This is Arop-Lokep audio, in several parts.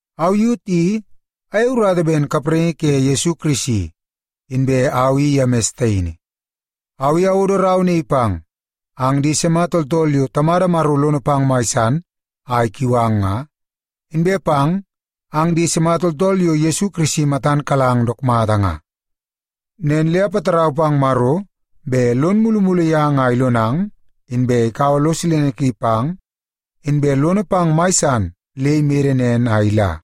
Au Yut i ayei urata ben kapraingi ke Yesu Kirisi, inbe au i Yemis taini. Au i awodo rau naii pang ang di sima tooltool yo Tamada Maro lono pang mai san a ikiu ang nga, inbe pang ang di sima tooltool yo Yesu Kirisi matan kalang dook mata nga. Nen le apatarau pang Maro bet lon mulumulu yang a ilonang, inbe ikaua lo silene ki pang, inbe lono pang mai san le imede nen a ila.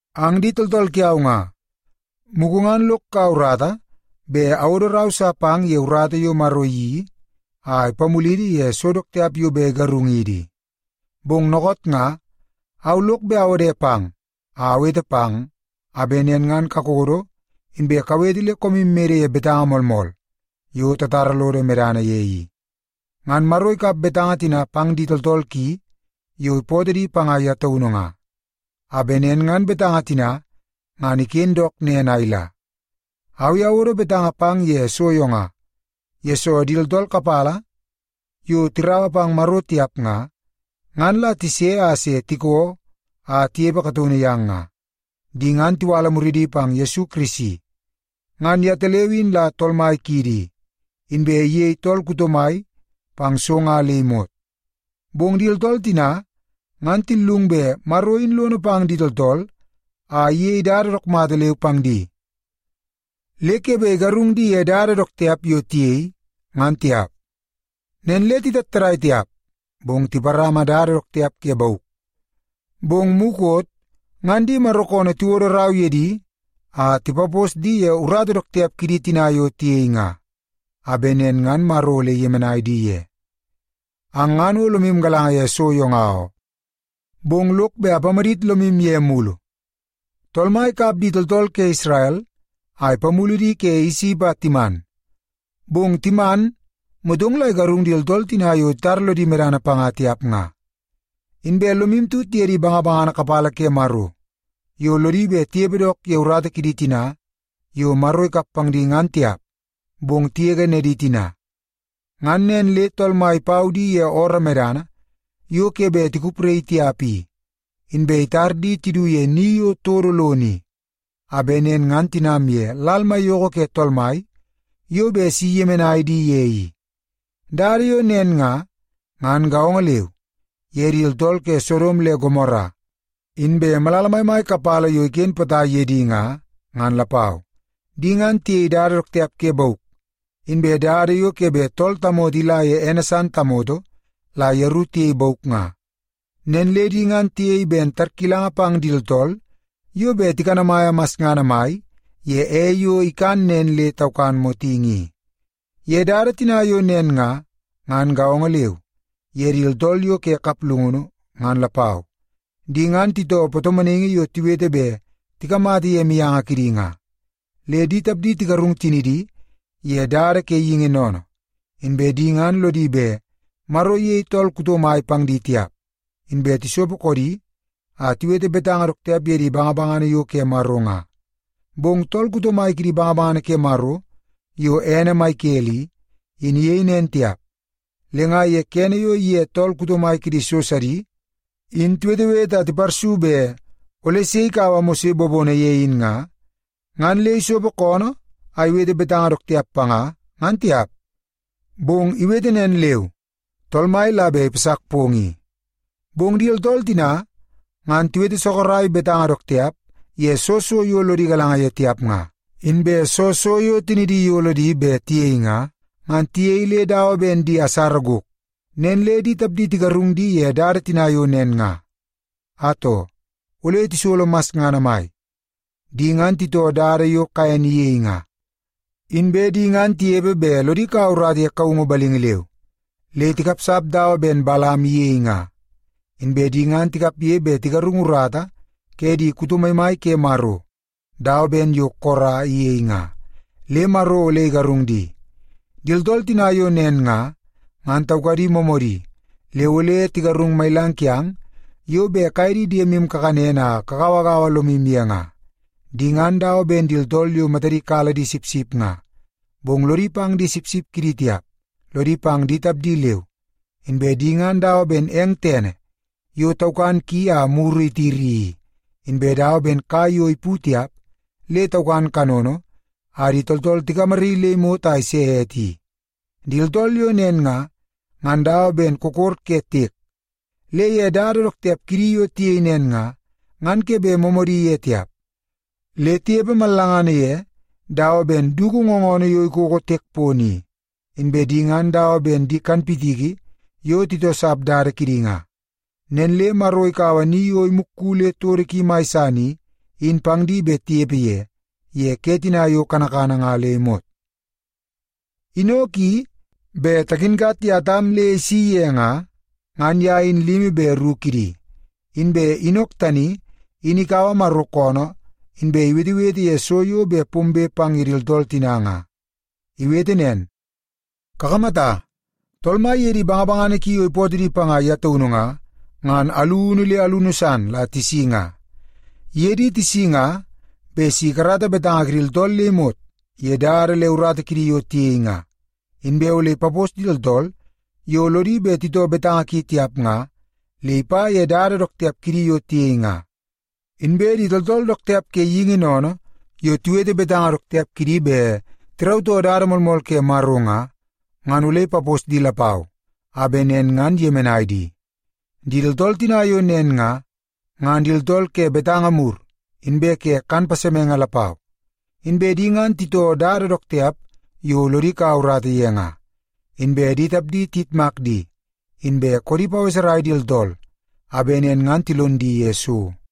Ang di tooltool kiau nga, mugu ngan lok kaua urata bet awodo rau sa pang ye urata yo Maro iyeii a ipamulidi ye so dook tiap yo bet igarungidi i. Bong dookoot nga, au lok bet awode pang a awete pang a bet nen ngan kakodo inbe kawete le koomu mede ye betanga moolmool yo tatara lodo medana ye i. Ngan Maro ikap betanga tina pang di tooltool ki yo ipootoo di panga ye taunu nga, a bet nen ngan betanga tina ngan iken dook nen a ila. Au i awodo betanga pang ye so yo nga, yesoo di tooltool kapala yo tiraua pang Maro tiap nga, ngan la tise a se tiko a tinepe kataunu yang nga. Di ngan tiwala muridi pang Yesu Kirisi. Ngan yetaleu in la Tool Mai kiidi i, inbe iyei tool kuto mai pang so nga le imot. Bong di tooltool tina ngan tillung bet Maro in lono pang di tooltool a iyei dada dook mata leu pang di, le ke bet igarung di ye dada dook tiap yo tiyei, ngan tiap. Nen le titattadaii tiap, bong tiparama dada dook tiap ke bauk. Bong mukot ngan di Maro koonoo tiwodo rau ye di a tipapos di ye urata dook tiap kidi tina yo tiyei nga, a bet nen ngan Maro ole iyemenai di ye. Ang ngan o lomu galanga ye so nga oo, bong lok bet apamadit lomu ye mulu. Tool Mai ikap di tooltool ke Isrel a ipamulu di ke Isip a timan, bong timan motong la igarung di tooltool tina yo titara lodi medana panga tiap nga. Inbe lomu tut ye di bangabangana kapala ke Maro yo lodi bet tinepe dook ye urata kidi tina yo Maro ikap pang di ngan tiap, bong tigege nedi tina. Ngan nen le Tool Mai ipau di ye ooroo medana yo ke bet tikupraii tiap i, inbe itar di tidu ye ni yo todo lono i, a bet nen ngan tinam ye Lal Maiyoko ke Tool Mai yo bet si iyemenai di ye i. Dada yo nen nga, ngan gaongo leu ye di tooltool ke Sodom le Gomora inbe malala maimai kapala yo iken potai pang ye di nga, ngan lapau. Di ngan tiyei dada dook tiap ke bauk, inbe dada yo ke bet tool tamoto ila ye ene san tamoto la yeru tiyei bauk nga. Nen le di ngan tiyei ben tarkilanga pang di tooltool yo bet tikanamaia masngana mai ye ei yo ikan nen le taukan motingi i. Ye dada tina yo nen nga, ngan gaongo leu ye di tooltool yo ke kaplungunu ngan lapau. Di ngan titoo patomonaingi yo tiwete bet tikamata ye mianga kidi nga, le di tapdi tigarung tinidi ye dada ke geingi sennene. Inbe di ngan lodi bet Maro iyei tool kuto mai pang di tiap, inbe tisopo koodi a tiwete betanga dook tiap ye di bangabangana yo ke Maro nga. Bong tool kuto mai kidi bangabangana ke Maro yo ene Mikel i, in iyei nen tiap. Le nga ye kene yo iye tool kuto mai kidi so sidi in tiwetewete a tiparsu bet ole sei bet ikaua Mose bobono ye in nga, ngan le isopo koonoo a iwete betanga dook tiap panga, ngan tiap. Bong iwete nen leu, “Tool Mai la bet ipasak pong i.” Bong di tooltool tina ngan tiwete sorok betanga dook tiap ye soo so yo lodi galanga ye tiap nga. Inbe soo so yo tinidi iyolo di bet tiyei nga, ngan tiyei le dawa ben di asara gok. Nen le di tapdi tigarung di ye dada tina yo nen nga. Atoo, ole tisolo masngana mai! Di ngan titoo dada yo Kaen iyei nga. Inbe di ngan tinepe bet lodi kaua urata ye kaungu balingi leu, le tikapsap dawa ben Balam iyei nga. Inbe di ngan tikapge bet tigarung urata ke di kuto maimai ke Maro dawa ben yo Kora iyei nga, le Maro ole igarung di. Di tooltool tina yo nen nga, ngan taukadi moomoodi le ole tigarung mailang kiang yo bet kaye di diemu kakanen a kagauagaua lomu ye nga. Di ngan dawa ben di tooltool yo matadi kala di sipsip nga. Bong lodi pang di sipsip kidi tiap, lodi pang di tapdi leu. Inbe di ngan dawa ben eng tene yo taukan ki a muru itiri i, inbe dawa ben kai yo ipu tiap le taukan kanono a di tooltool tigamaraii le imot a ise ete i. Di tooltool yo nen nga, ngan dawa ben kokor ke tiek. Le ye dada dook tiap kidi yo tiyei nen nga, ngan ke bet moomoodi ye tiap, le tinepe mallangana ye dawa ben dugu ngoonoo yo ikoko tiek pono i. Inbe di ngan dawa ben di kanpitiki yo titoosap dada kidi nga. Nen le Maro ikaua ni yo imukku le todo ki mai san i, in pang di bet tinepe ye, ye ke tina yo kanakana nga le imot. Inok i, bet takinkat ye Atam le isi ye nga, ngan ye in limi be ru kidi. Inbe Inok tani in ikaua Maro koonoo inbe iwetewete ye so yo bet pombe pang ye di tooltool tina nga. Iwete nen, “Kakamata, Tool Mai iye di bangabangana ki yo ipootoo di panga ye taunu nga, ngan alunu le alunu san la tisi nga. Iye di tisi nga bet si ikarata betanga kidi tooltool le imot ye dada le urata kidi yo tiyei nga. Inbe ole ipapos di tooltool yo lodi bet titoo betanga ki tiap nga le ipa ye dada dook tiap kidi yo tiyei nga. Inbe di tooltool dook tiap ke geingi sennene yo tiwete betanga dook tiap kidi bet tirautoo dada moolmool ke Maro nga, ngan ole ipapos di lapau a bet nen ngan iyemenai di.” Di tooltool tina yo nen nga, ngan di tooltool ke betanga mur inbe ke kan pasemenge lapau. Inbe di ngan titoo dada dook tiap yo lodi ikau urata ye nga. Inbe di tapdi tiyitmak di, inbe koodi paweserai di tooltool a bet nen ngan tilon di ye so.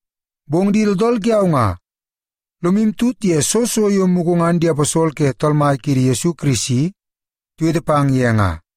Bong di tooltool kiau nga, lomu tut ye soo so yo mugu ngan di aposol ke Tool Mai kiidi Yesu Kirisi tiwete pang ye nga.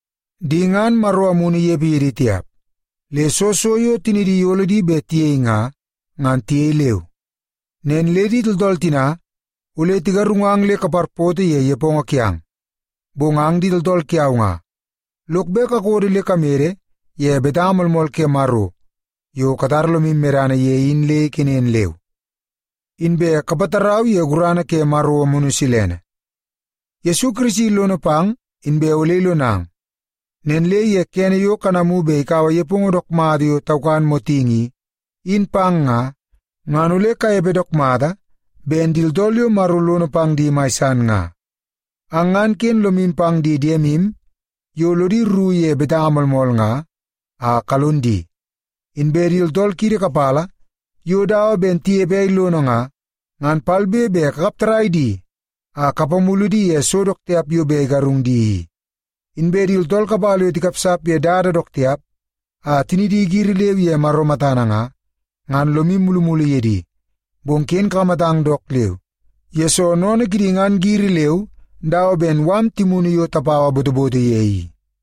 Di ngan Maro Amunu inepe ye di tiap, le soo so yo tinidi iyolo di bet tiyei nga, ngan tiyei leu. Nen le di tooltool tina ole tigarungang le kaparpoto ye nepongo kiang. Bong ang di tooltool kiau nga, lok bet kakodo le kamede ye betanga moolmool ke Maro yo katara lomu medana ye in le ikenen leu, inbe kapatarau ye gurana ke Maro Amunu Silene. Yesu Kirisi lono pang inbe ole ilonang. Nen le ye kene yo kanamu bet ikaua nepongo dook mata yo taukan motingi i, in pang nga, ngan ole kanepe dook mata ben di tooltool yo Maro lono pang di mai san nga. Ang ngan ken lomu pang di diemu yo lodi rru ye betanga moolmool nga, a kalon di. Inbe di tooltool kiidi kapala yo dawa ben tinepe ei lono nga, ngan palbe be kakap tarrai di a kapamulu di ye so dook tiap yo bet igarung di i. Inbe di tooltool kapala yo tikapsap ye dada dook tiap a tinidi giri leu ye Maro matana nga, ngan lomu mulumulu ye di, bong ken kakamatang dook leu, yesoo sennene kidi ngan giri leu dawa ben mala timunu yo tapaua botoboto ye i.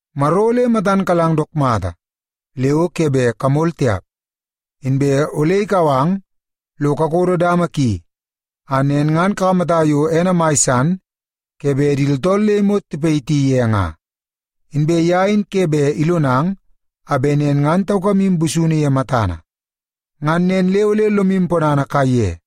Maro ole matan kalang dook mata le o ke bet kamol tiap. Inbe ole ikau ang lo kakodo dama ki a nen ngan kakamata yo ene mai san ke bet di tooltool le imot tipayiti ye nga. Inbe ye in ke bet ilonang a bet nen ngan taukamu busunu ye matana. Ngan nen le ole lomu ponana kaiye.